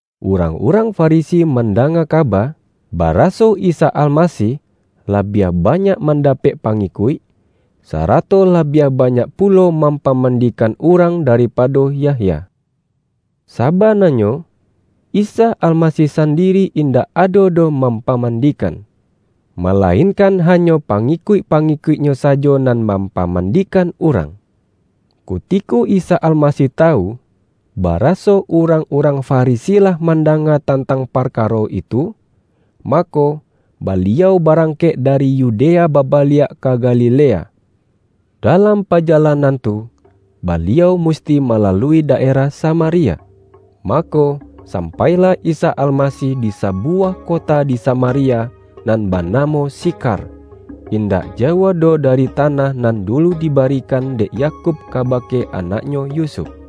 Urang-urang Farisi mandanga kaba, baraso Isa Almasih labiah banyak mandapek pangikuik, sara-to labiah banyak pulo mampamandi-kan urang daripado Yahya. ( Saba-nanyo, Isa Almasih sandiri indak ado doh mampamandikan, malainkan ha-nyo pangikuik-pangikuik-Nyo sajo nan mampamandikan urang.) Kutiko Isa Almasih tawu, baraso urang-urang Farisi lah mandanga tantang parkaro itu, mako, Baliau barangkek dari Yu-dea babaliak ka Galilea. Dalam pa-jalanan tu, Baliau musti malalui da-erah Samaria. Mako, sampailah Isa Almasih di sabuwah kota di Samaria, nan banamo Sikhar, indak jauah doh dari tanah nan dulu dibarikan dek Yakub kabake anaknyo Yusuf.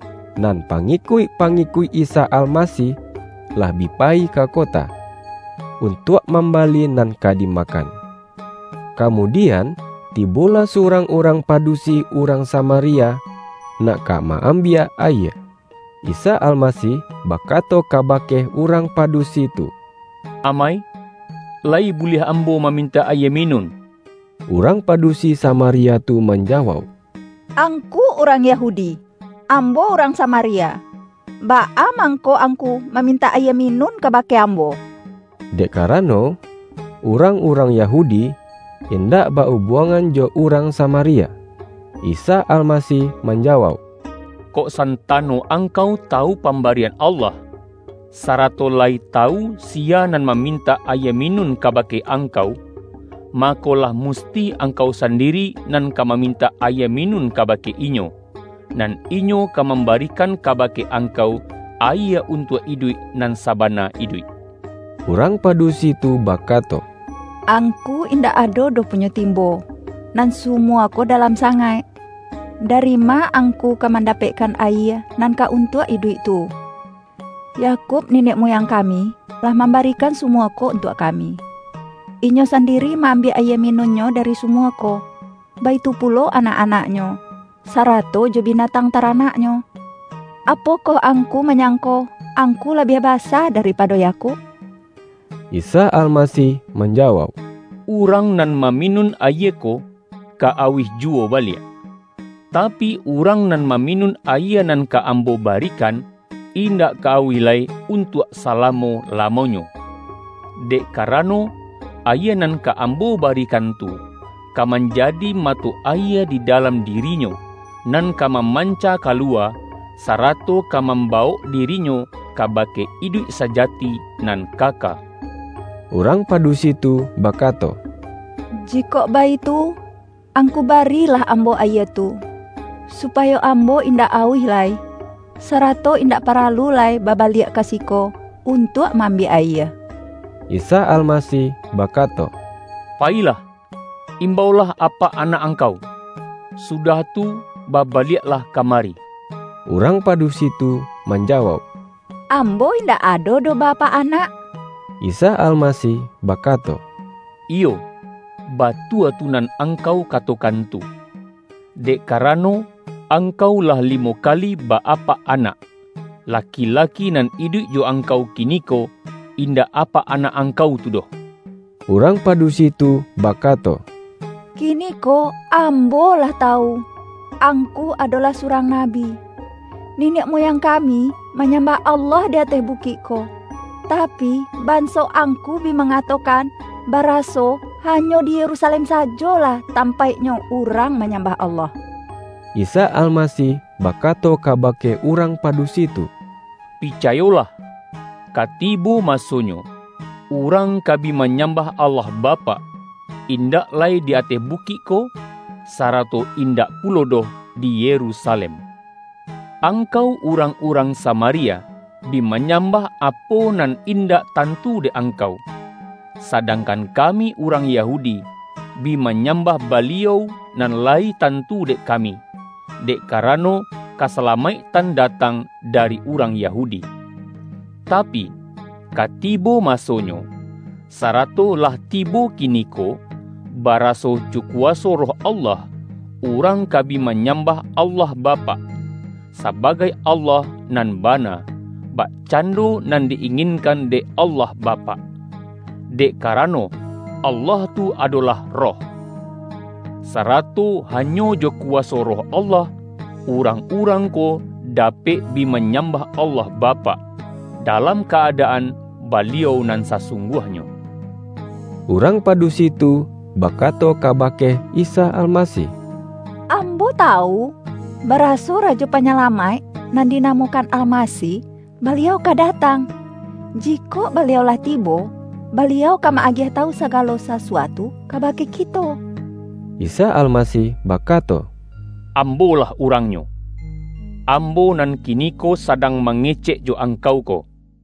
Nan pangikuik-pangikuik Isa Almasih lah bi payi ka kota, untuak mambali nan ka dimakan. Kamudian, tibolah surang urang pa-dusi urang Samaria, nak ka ma-am-biak ayie. Isa Almasih bakato kaba-ke urang padusi tu,”Amai, layi buliah Ambo mamintak ayie minun?” Urang padusi Samaria tu manja-wauk,”Angku urang Yahudi, ambo urang Samaria, baa mangko Angku mamintak ayie minun kabake ambo?” (Dek karano, urang-urang Yahudi in-dak ba-ubuangan jo urang Samaria.) Isa Almasih manjawauk,”Kok san-tano angkau tawu pambarian Allah, sarato layi tawu siya nan mamintak ayie minun kabake angkau, mako, lah musti angkau sandiri nan ka mamintak ayie minun kabake Inyo, nan Inyo ka mambarikan kabake angkau ayie un-tuak iduik, nan sabana iduik.” Urang padusi tu bakato,”Angku in-dak ado doh punyo timbo, nan sumua ko dalam sangaik. Dari ma Angku ka mandapekkan ayie nan ka untuak iduik tu? Yakub, niniak muyang kami, lah mambarikan sumua ko untuak kami. Inyo sandiri ma-ambiak ayie minun-nyo dari sumua ko, baitu pulo anak-anaknyo, sarato jo binatang taranak-nyo. Apokoh Angku manyangko, Angku labiah basa daripado Yakub?” Isa Almasih manjawauk,”Urang nan maminun ayie ko, ka auih juwo baliak, tapi, urang nan maminun ayie nan ka Ambo barikan, indak ka auih lai untuak salamo-lamonyo. Dek karano, ayie nan ka Ambo barikan tu, ka manjadi mato ayie di dalam diri-nyo, nan ka mamanca kaluwa, sarato ka mambawok dirinyo kabake iduik sajati nan kaka.” Urang padusi tu bakato,”Jikok baitu, Angku barilah ambo ayie tu, supayo ambo indak auih lai, sarato indak paralu lai babaliak ka siko, un-tuak ma-ambiak ayie.” Isa Almasih bakato,”Payilah, im-baulah apak anak angkau, sudah tu, babaliaklah ka mari.” Urang padusi tu manjawauk,”Am-bo indak ado doh ba-apak anak,” Isa Almasih bakato,”Iyo, batua tu nan angkau katokan tu. Dek karano, angkau lah limo kali ba-apak anak, la-ki-laki nan iduik jo angkau kiniko, in-dak apak anak angkau tu doh.” Urang padusi tu bakato,”Kiniko ambo lah tawu, Angku adolah surang Nabi. Niniak muyang kami manyam-bah Allah di ateh bukik ko, tapi, ban-so Angku bi mangatokan, baraso, ha-nyo di Yerusalem sajolah tampaiknyo urang manyambah Allah.” Isa Almasih bakato kabake urang padusi tu,”Picayolah, ka tibo masonyo, urang ka bi manyambah Allah Bapak, indak lai di ateh bukik ko, sarato in-dak pulo doh di Yerusalem. Angkau urang-urang Samaria, bi manyambah apo nan indak tantu dek angkau, sa-dangkan kami urang Yahudi, bi ma-nyambah Baliau nan layi tantu dek kami, dek karano, kasalamaiktan da-tang dari urang Yahudi. Tapi, ka ti-bo masonyo, sarato lah tibo kiniko, baraso, jo kuwaso Roh Allah urang ka bi manyambah Allah Bapak, sa-bagai Allah nan bana, bakcando nan di-inginkan dek Allah Bapak. Dek karano, Allah tu adolah Roh, sarato hanyo jo kuwaso Roh Allah, urang-urang ko dapek bi manyambah Allah Bapak, dalam ka-adaan Baliau nan sa-sungguahnyo.” Urang padusi tu bakato kaba-ke Isa Almasih,”Ambo tawu, baraso Rajo Panyalamaik, (nan dinamokan Almasih,) Baliau ka datang. Jikok Ba-liau lah tibo, Baliau ka ma-agiah tawu sagalo sasuatu kabake kito.” Isa Almasih bakato,”Ambo-lah Urang-Nyo, Ambo nan kiniko sadang mangecek jo angkau ko.”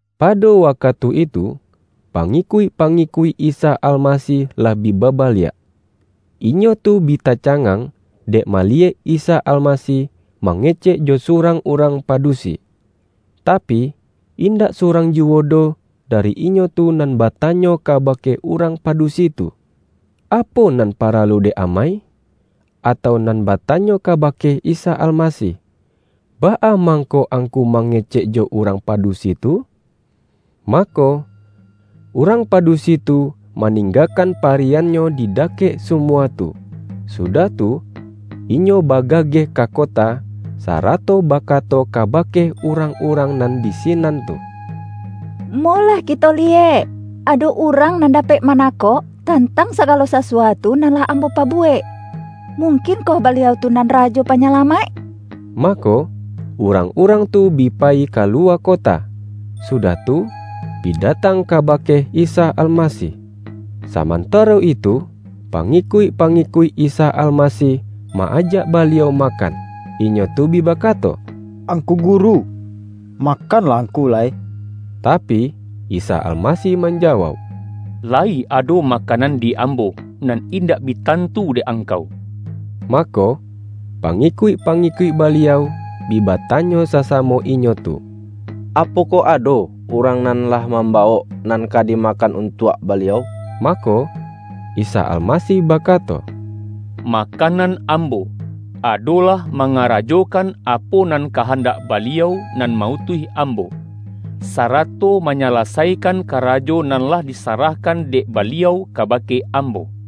Pado wakatu itu, pangikuik-pa-ngikuik Isa Almasih lah bi babaliak. Inyo tu bi tacangang, dek maliyek Isa Almasih mangecek jo surang urang pa-dusi. Tapi, indak surang juwo doh da-ri inyo tu, nan batanyo kabake urang padusi tu,”Apo nan paralu dek amai?” atau nan batanyo kabake Isa Almasih,”Baa mangko Angku mangecek jo urang padusi tu?” Mako, urang padusi tu maning-gakan pariyannyo di dakek sumua tu, sudah tu, inyo bagageh ka kota, sarato bakato kabake urang-urang nan di sinan tu, ”Molah kito liyek, ado Urang nan dapek manakok, tantang sagalo sasuatu nan lah ambo pabu-wek. Mungkinkoh Baliau tu nan Rajo Panyalamaik?” Mako, urang-urang tu bi payi kaluwa kota, sudah tu, bi datang kabake Isa Almasih. Samantaro itu, pangikuik-pangi-kuik Isa Almasih ma-ajak Baliau ma-kan. Inyo tu bi bakato,”Angku Guru, makanlah Angku lai.” Tapi, Isa Almasih manjawauk,”La-yi ado makanan di Ambo, nan indak bi tantu dek angkau.” Mako, pangikuik-pangikuik Baliau, bi batanyo sasamo inyo tu,”Apokoh ado urang nan lah mambawok nan ka dimakan untuak Baliau?” Mako, Isa Almasih bakato,”Ma-kanan Ambo, adolah mangarajokan apo nan kahandak Baliau nan ma-utuih Ambo, sarato manyalasaikan karajo nan lah disarahkan dek Baliau kaba-ke Ambo.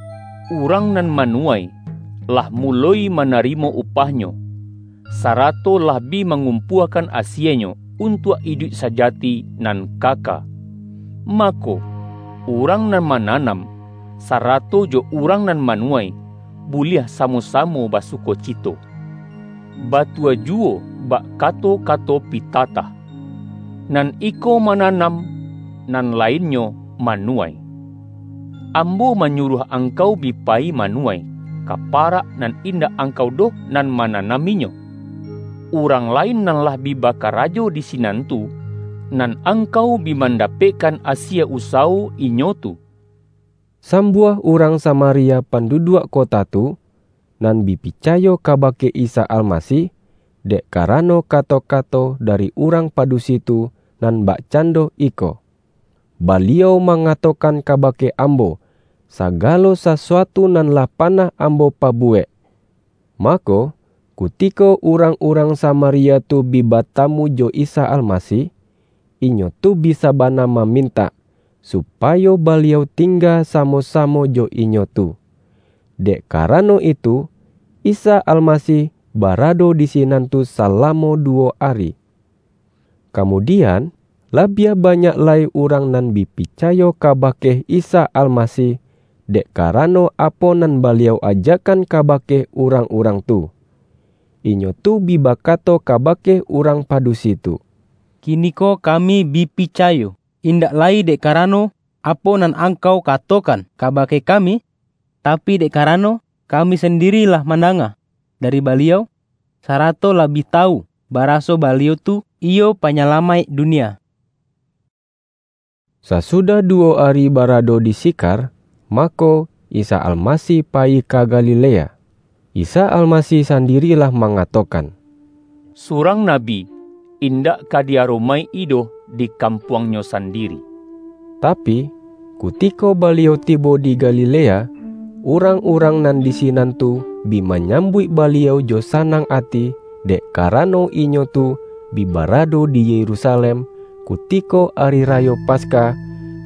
Urang nan manu-wai, lah muloi manarimo upahnyo, sa-rato lah bi mangumpuakan asienyo, untuak iduik sajati nan kaka. Mako, urang nan mananam, sarato jo urang nan manuwai, buliah samo-samo ba-sukocito. Batua juwo bak kato-kato pitatah, ’Nan iko mananam, nan la-innyo manuwai.’ Ambo manyuruah angkau bi payi manuwai, ka parak nan indak angkau doh nan mananaminyo. Urang lain nan lah bi bakarajo di si-nan tu, nan angkau bi mandapekkan asie usawo inyo tu.” Sambuah urang Samaria pandu-duak kota tu, nan bi picayo kabake Isa Almasih, dek karano kato-kato da-ri urang padusi tu, nan bakcando iko,”Baliau mangatokan kabake ambo, sa-galo sasuatu nan lah panah ambo pa-buwek.” Mako, kutiko urang-urang Samaria tu bi batamu jo Isa Almasih, inyo tu bi sabana mamintak, supayo Baliau tingga samo-samo jo inyo tu. Dek karano itu, Isa Almasih barado di sinan tu salamo duwo ari. Kamudian, labiah banyak lai urang nan bi picayo kabake Isa Almasih, dek karano apo nan Baliau ajakan kaba-ke urang-urang tu. Inyo tu bi ba-kato kabake urang padusi tu,”Kiniko kami bi picayo, indak lai dek karano apo nan angkau katokan kabake ka-mi, tapi, dek karano kami sandiri lah mandanga dari Baliau, sarato lah bi tawu, baraso Baliau tu iyo Panyala-maik dunia.” Sasudah duwo ari barado di Si-khar, mako, Isa Almasih payi ka Ga-lilea. Isa Almasih sandiri lah ma-ngatokan,”Surang nabi indak ka di-aromaik-i doh di kampuangnyo san-diri.” Tapi, kutiko Baliau tibo di Ga-lilea, urang-urang nan di sinan tu bi manyambuik Baliau jo sanang ati, dek karano, inyo tu bi barado di Yerusa-lem, kutiko Ari Rayo Paskah,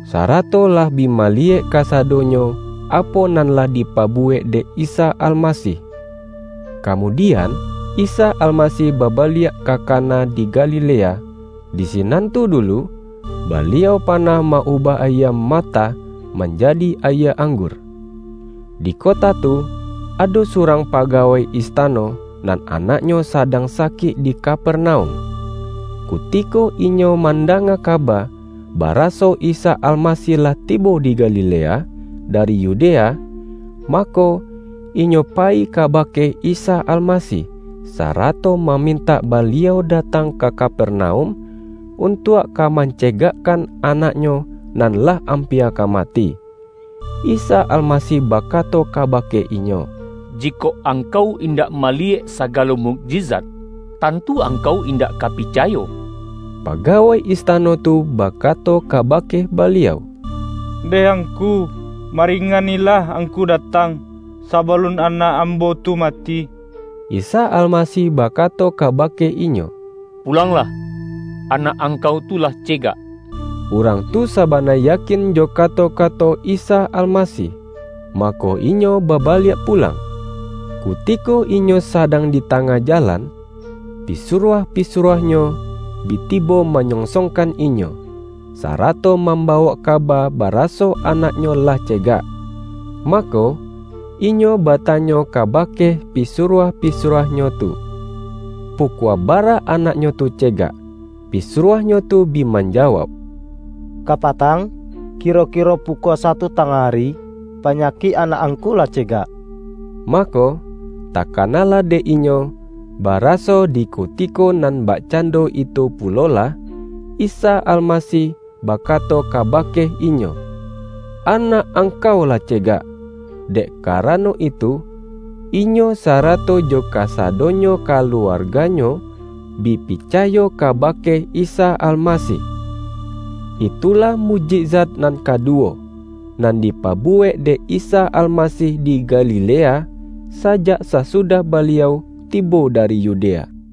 sarato lah bi maliyek kasadonyo apo nan lah di pabuwek dek Isa Almasih. Kamudian, Isa Almasih babaliak ka Kana di Galilea, di sinan tu dulu, Baliau panah ma-ubah ayie matah, man-jadi ayie anggur. Di kota tu, ado surang pagawai istano, nan anaknyo sadang sa-kik di Kapernaum. Kutiko inyo man-danga kaba, baraso Isa Almasih lah ti-bo di Galilea dari Yudea, mako, inyo payi kabake Isa Almasih, sarato ma-mintak Baliau datang ka Kapernaum, untuak ka mancegakkan anaknyo nan lah ampia ka mati. Isa Almasih ba-kato kabake inyo,”Jikok angkau indak maliyek sagalo mukjizat, tantu angkau indak ka picayo.” Pagawai istano tu bakato kaba-ke Baliau,”Ndeh Angku, maringanilah Angku datang, sabalun anak am-bo tu mati.” Isa Almasih bakato kabake inyo,”Pulanglah, anak angkau tu lah ce-gak.” Urang tu sabana yakin jo kato-kato Isa Almasih, mako, inyo babaliak pu-lang. Kutiko inyo sadang di tangah jalan, pisuruah-pisuruahnyo bi tibo manyonsongkan inyo, sarato mam-bawok kaba baraso anaknyo lah ce-gak. Mako, inyo batanyo kabake pi-suruah-pisuruahnyo tu, pukua bara anaknyo tu cegak. Pisuruahnyo tu bi manjawauk,”Kapatang, kiro-kiro pu-kua satu tangah ari, panyakik anak angku lah cegak.” Mako, takanalah dek inyo, baraso di kutiko nan bak-cando itu pulolah, Isa Almasih baka-to kabake inyo,”Anak angkau lah ce-gak.” Dek karano itu, inyo sarato jo kasadonyo kaluarganyo, bi picayo ka-bake Isa Almasih. Itulah mukjizat nan kaduwo, nan dipabuwek dek Isa Almasih di Gali-lea, sajak sasudah Baliau tibo dari Yu-dea. YAHYA